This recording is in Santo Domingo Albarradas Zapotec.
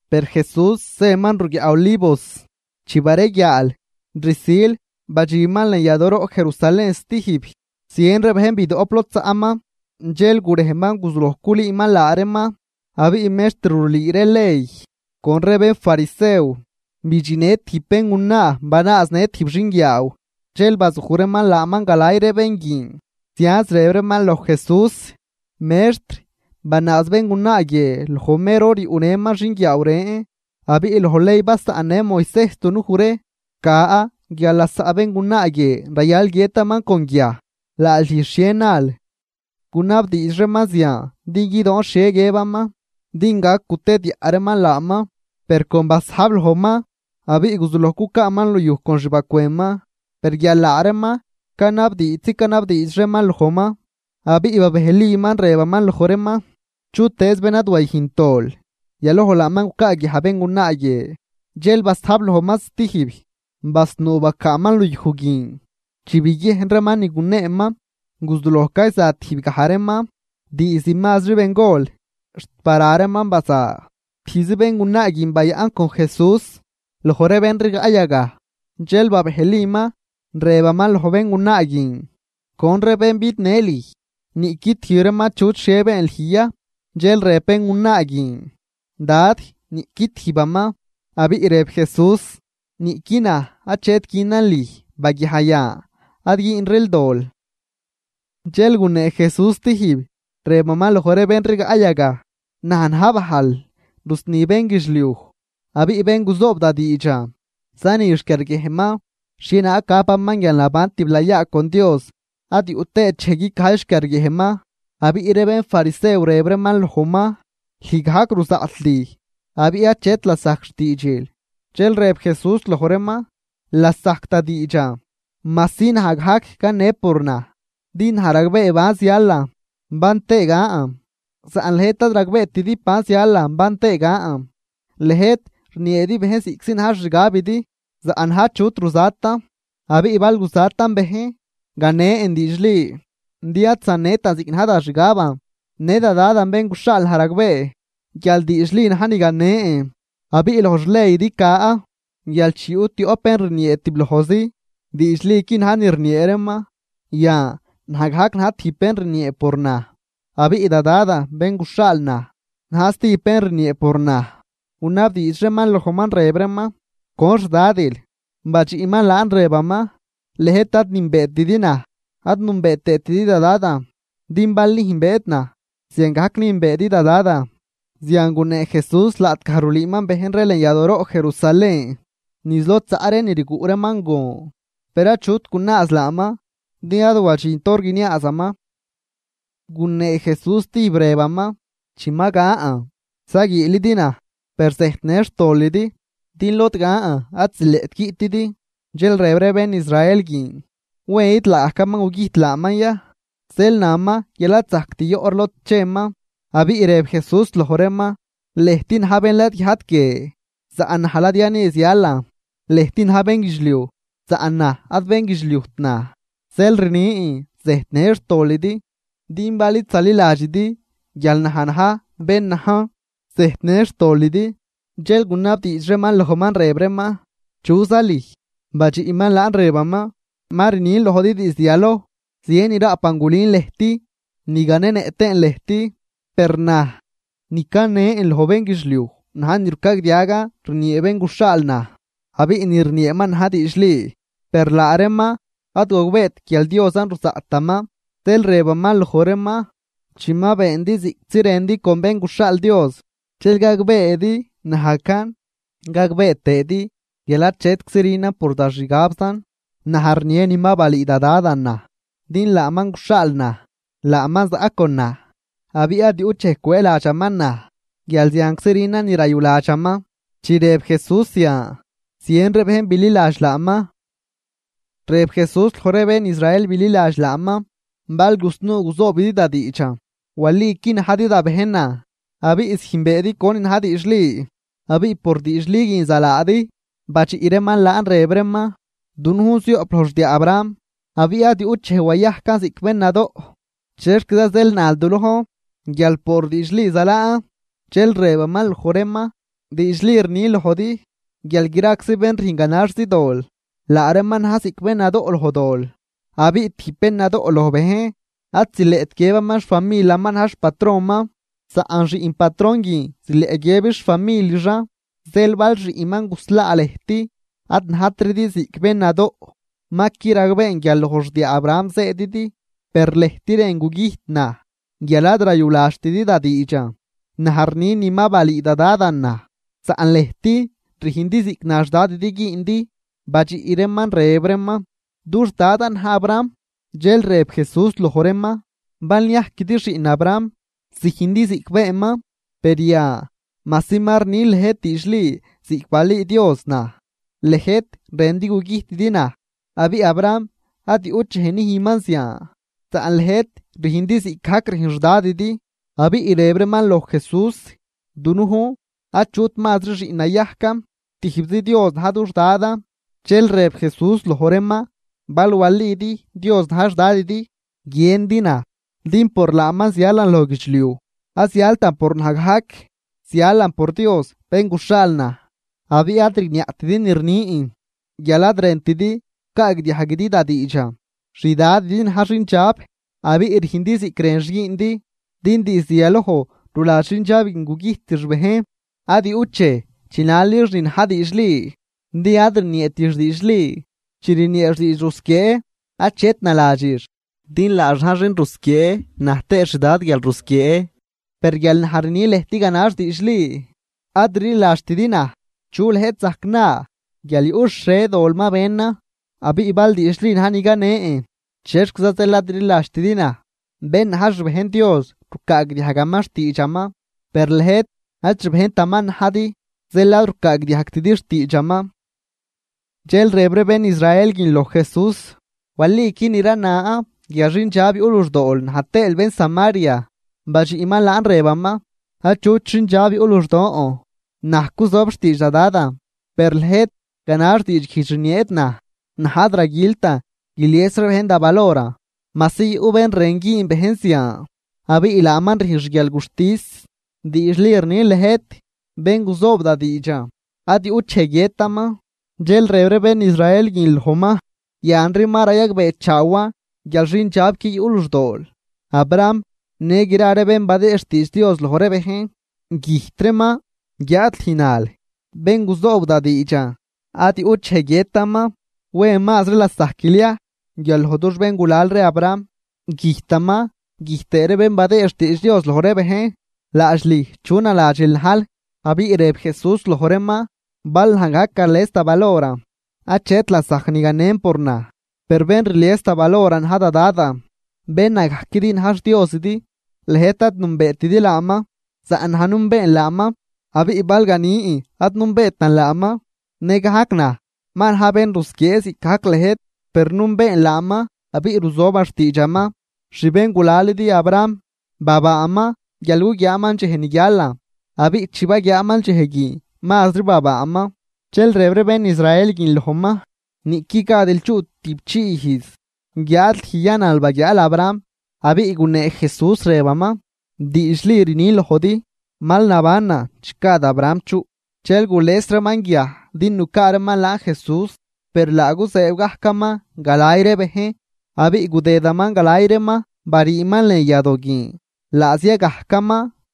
Per Jesús zëman ruguiaꞌ Olivos. Chi bareguiaal, rsil badxinman lën yadooroꞌ Jerusalén stijb. Zien ree bejn bidoꞌp lod zaꞌman, dxel gurejman guzuloj culüüman laa reeman. Abiꞌ mextr rulüü ree ley con ree bénfarisew bidxinnë tijb béngunaa banaaznë tijb xinguiaaw, dxel bazuj reeman laaman galay ree bén guin, zianz rëb reeman loj Jesús: ―Mextr, banaaz béngunaa guie loj mer hor ni yuꞌnëman xinguiaaw ren. Abiꞌ loj ley basaꞌnnë Moisejs dunuj ree ca guial lasaꞌ béngunaa guie rayal guiëtaman con guiaj. ¿Laadx lüj xhie nal? Gunabdiidx reeman zian din guidoon xhie guiëbaman din gac gutediaꞌ reeman laaman. Per con basajb lojman abiꞌ guzulojman cucaaman luyuj con xbacwënman. Per guial laa reeman canabdiidxzi canabdiidx reeman lojman, abiꞌ babejliman, rëbaman loj reeman: ―Chutëëz bén ad wayüjnt dol, yaloj laaman gucaaguiaj béngunaa guie. Dxel basajb lojman stijb, basnuu bacaaman luyuj guin. Chi biguiejn reeman ni guneeman, guzuloj cayza tijbgaj reeman, diizd mazri bengol xt bara reeman baza. Tijbzi béngunaa guin bayaꞌn con Jesús loj ree bén rigaꞌ yagaj. Dxel babejliman, rëbaman loj béngunaa guin: ―¿Con ree bén bidnë lüj? ¿Niꞌqui tijb reeman achut xhie been lüj ya? Dxel rëb béngunaa guin: ―Dad, niꞌqui tijbaman. Abiꞌ rëb Jesús: ―Niꞌqui naj achet günan lüj. Baguiaj yan, ad güünril dol. Dxel gunee Jesús stijb, rëbaman loj ree bén rigaꞌ yagaj: ―Naj na̱j bajl rusni bénguidxliuj. Abiꞌ bén guzoob da diidxan, zani xquiarguiejnman xhienaag gapaman guialnaban tiblayaa con Dios, ad yuꞌ tëët dxej guicajy xquiarguiejnman. Abiꞌ ree bénfarisew rëb reeman lojman: ―Lüj gajc ruzaꞌt lüj, abiꞌ achet lasajc xtiidxil. Dxel rëb Jesús loj reeman: ―Lasajc da diidxan, majsi naj gajc cane por naj, din naj ragbee ban zialan ban tëë gan, saꞌn lëjt ad ragbeetidi ban zialan ban tëë gan. Lëjt rnieedi bejn ziꞌctizi na̱j xixgabidi, saꞌn naj achut ruzatan. Abiꞌ bal guzatan bejn, ganen diidxli, din ad zanetan ziꞌc na̱j da xgaban, në da Dadan bén guxhaal naj ragbee guial diidxli na̱j ni ganen. Abiꞌ loj xleydi ca guial chi yuꞌ tioꞌp bén rniee tiblojzi, diidxliqui na̱j ni rniee reeman. Yan, naj gajc na̱j tijb bén rniee por naj, abiꞌ da Dadan bén guxhaal naj, na̱j stijb bén rniee por naj. Gunabdiidx reeman lojman rëb reeman: ―¿Con xdadil? Badxiꞌman laan rëbaman: ―Lëjt ad nünbeetidi naj, ad nünbee tëëtidi da Dadan, din bal nüjnbeedi naj, ziangajc nüjnbeedi da Dadan. Zian gunee Jesús laꞌtgaj rulüüman bejn ree lën yadooroꞌ Jerusalén, niz lod zaꞌ ree ni rguꞌ reeman gon. Per achut gunaaz laaman, din ad wadxint hor guiniaazaman. Gunee Jesús stijb, rëbaman: ―Chi ma gan, zaguiilidi naj, per zëjtnë xtolidi, din lod gan ad zileꞌt guiꞌtidi. Dxel rëb ree bén Israel guin: ―¿Wen ni laagajcaman gugüjt laaman ya, zeel naman guial ad zajct yoꞌ ree lod cheman? Abiꞌ rëb Jesús loj reeman: ―Lëjt na̱j bén ladguiajt guie, saꞌn naj ladya ni zialan. Lëjt na̱j bénguidxliuj, saꞌn naj ad bénguidxliujt na̱j. Zeel rnin, zëjtnë xtolidi. Din bal id zaliladxidi guial naj na̱j bén najn, zëjtnë xtolidi. Dxel gunabdiidx reeman lojman, rëb reeman: ―¿Chuza lüj? Badxiꞌman laan rëbaman: ―Ma rnin lojdi diizd yaloj. Zien ni raꞌpan gulün lëjt ni ganenëꞌ tëën lëjt. Per naj, ni canen loj bénguidxliuj na̱j ni rucagdiagan rniee bén guxhaal naj, abiꞌ ni rnieeman na̱j diidxli. Per laa reeman ad gogbeet guial Diosan ruzaꞌtaman. Zeel rëbaman loj reeman: ―Chi ma beendi ziꞌctizi rëndi con Bén guxhaal Dios, dxel gagbeedi najcan, gagbee tëëdi guial achetczi rünan por da xgabzan, naj rnie ni ma balüü da Dadan naj. Din laaman guxhaal naj, laaman zaꞌ con naj, abiꞌ ad yuꞌt dxej cwëëladxaman naj, guial zianczi rünan ni rayuladxaman. Chi rëb Jesús zian, zien ree bejn bililadx laaman. Rëb Jesús loj ree bén Israel bililadx laaman: ―Bal gusnuu guzoobidi da diidxan, waliqui najdi da bejnan, abiꞌ züjnbeedi conin na̱j diidxli, abiꞌ por diidxli guin zalaadi. Badxiꞌ reeman laan rëb reeman: ―Dunujn zioꞌp loj xdiaa Abraham, abiꞌ ad yuꞌt dxej wayajcan ziꞌc bén nadoꞌ. ¿Chexquiza zeel nal du lojn, guial por diidxli zalaan? Dxel rëbaman loj reeman: ―Diidxli rnin lojdi, guial graczi bén rüjn ganaxzi dol, laa reeman na̱j ziꞌc bén nadoꞌ loj dol. Abiꞌ tijb bén nadoꞌ loj bejn, ad zileꞌt guiëbaman xfamilaman na̱j xpatronman, saꞌn xiꞌn patron guin zileꞌ guiëbix xfamilixan. Zeel bal Xiꞌnman guslaa lëjt, ad najtridi ziꞌc bén nadoꞌ. Ma qui ragbeen guial loj xdiaa Abraham zëëdidi, per lëjt rën gugüjt naj guial ad rayuladxtidi da diidxan. Naj rni ni ma balüü da Dadan naj, saꞌn lëjt rüjndi ziꞌc na xDadidi güündi. Badxiꞌ reeman rëb reeman: ―Dux Dadan na̱j Abraham. Dxel rëb Jesús loj reeman: ―Bal niajquidi xiꞌn Abraham, züjndi ziꞌc beenman. Per yan, majsi ma rnin lëjt diidxli ziꞌc balüü Dios naj, lëjt rëndi gugüjtidi naj. ¡Abiꞌ Abraham ad yuꞌt dxej nüjnman zian! Saꞌn lëjt rüjndi ziꞌcgajc rüjn xDadidi. Abiꞌ rëb reeman loj Jesús: ―Dunujn achut mazri xiꞌn nayajcan. Tijbzi Dios na̱j dux Dadan. Dxel rëb Jesús loj reeman: ―Bal walidi Dios na̱j xDadidi, guiëndi naj, din por laaman zialan loj guidxliuj. Ad zialtan por naj gajc, zialan por Dios bén guxhaal naj. Abiꞌ ad rigniaꞌtidi ni rnin, guial ad rëntidi gucaagdiajguidi da diidxan. XDadidi na̱j xindxab, abiꞌ rüjndi ziꞌc rënx güündi, din diizd yaloj ruladx xindxab guin gugüjtix bejn. Ad yuꞌt dxej chinalix ni na̱j diidxli, din ad rnieetix diidxli. Chi rnieex diidx rusquiee, achet naladxix, din laax na̱j xin rusquiee na̱j tëëx xdad guialrusquiee. Per guial naj rni lëjt ganax diidxli, ad rliladxtidi naj. ¿Chu lëjt zajc na guial yuꞌ xhie dol ma benan? Abiꞌ bal diidxli na̱j ni canen, ¿chexquiza zeel ad rliladxtidi naj? Bén na̱j xbejn Dios rucaagdiajgaman xtiidxaman, per lëjt ad xbejntaman najdi, zeel ad rucaagdiajgtidi xtiidxaman. Dxel rëb ree bén Israel guin loj Jesús: ―Waliqui ni ranan guial xindxab yuꞌ luxdool na̱j tëël bén Samaria. Badxiꞌman laan rëbaman: ―Achut xindxab yuꞌ luxdon, naj cuzob xtiidx da Dadan, per lëjt ganax diidxguijdx rnieedi naj. Naj ad raguiltan guilies ree bejn da valoran, majsi yuꞌ bén rën güün bejn zian, abiꞌ laaman rüjn xguialguxtis. Diidxli rnin lëjt, bén guzoob da diidxan, ad yuꞌt dxej guiëtaman. Dxel rëb ree bén Israel guin lojman: ―Yanri ma rayagbeechaawan guial xindxabqui yuꞌ luxdool. Abraham në gra ree bén badëë xtiidx Dios loj ree bejn, güjt reeman, guiáad lüj nal: “Bén guzoob da diidxan, ad yuꞌt dxej guiëtaman.” ¿Wen mazri lasajquil ya guial loj dux béngulal ree Abraham? Güjtaman, güjt tëë ree bén badëë xtiidx Dios loj ree bejn. ¿Laadx lüj chu naladxil najl? Abiꞌ rëb Jesús loj reeman: ―Bal naj gajc gales da valoran, achet lasajc ni ganen por naj. Per bén rlies da valoran na̱j da Dadan, bén nagajquidi na̱j xDiosidi. Lëjt ad nünbeetidi laaman, saꞌn naj nünbeen laaman. Abiꞌ bal ganin ad nünbeetan laaman, nëgajc naj ma na̱j bén rusquiee ziꞌcgajc lëjt. Per nünbeen laaman abiꞌ ruzoban xtiidxaman. Xbéngulalidi Abraham, babaaman guial guguiaaman dxej ni guialan. Abiꞌ chi baguiaaman dxej guin, mazri babaaman. Dxel rëb ree bén Israel guin lojman: ―Niꞌqui gadil chuꞌ tüꞌpchii ijz, ¿guiáad lüj ya nal baguiaal Abraham? Abiꞌ gunee Jesús rëbaman: ―Diidxli rnin lojdi, mal nabanan chi gad Abraham chuꞌ. Dxel gules reeman guiaj din nucaa reeman laan Jesús. Per laa guzëëb gajcaman galay ree bejn, abiꞌ gudëdaman galay reeman bariiman lën yadoo guin, laa zia gajcaman.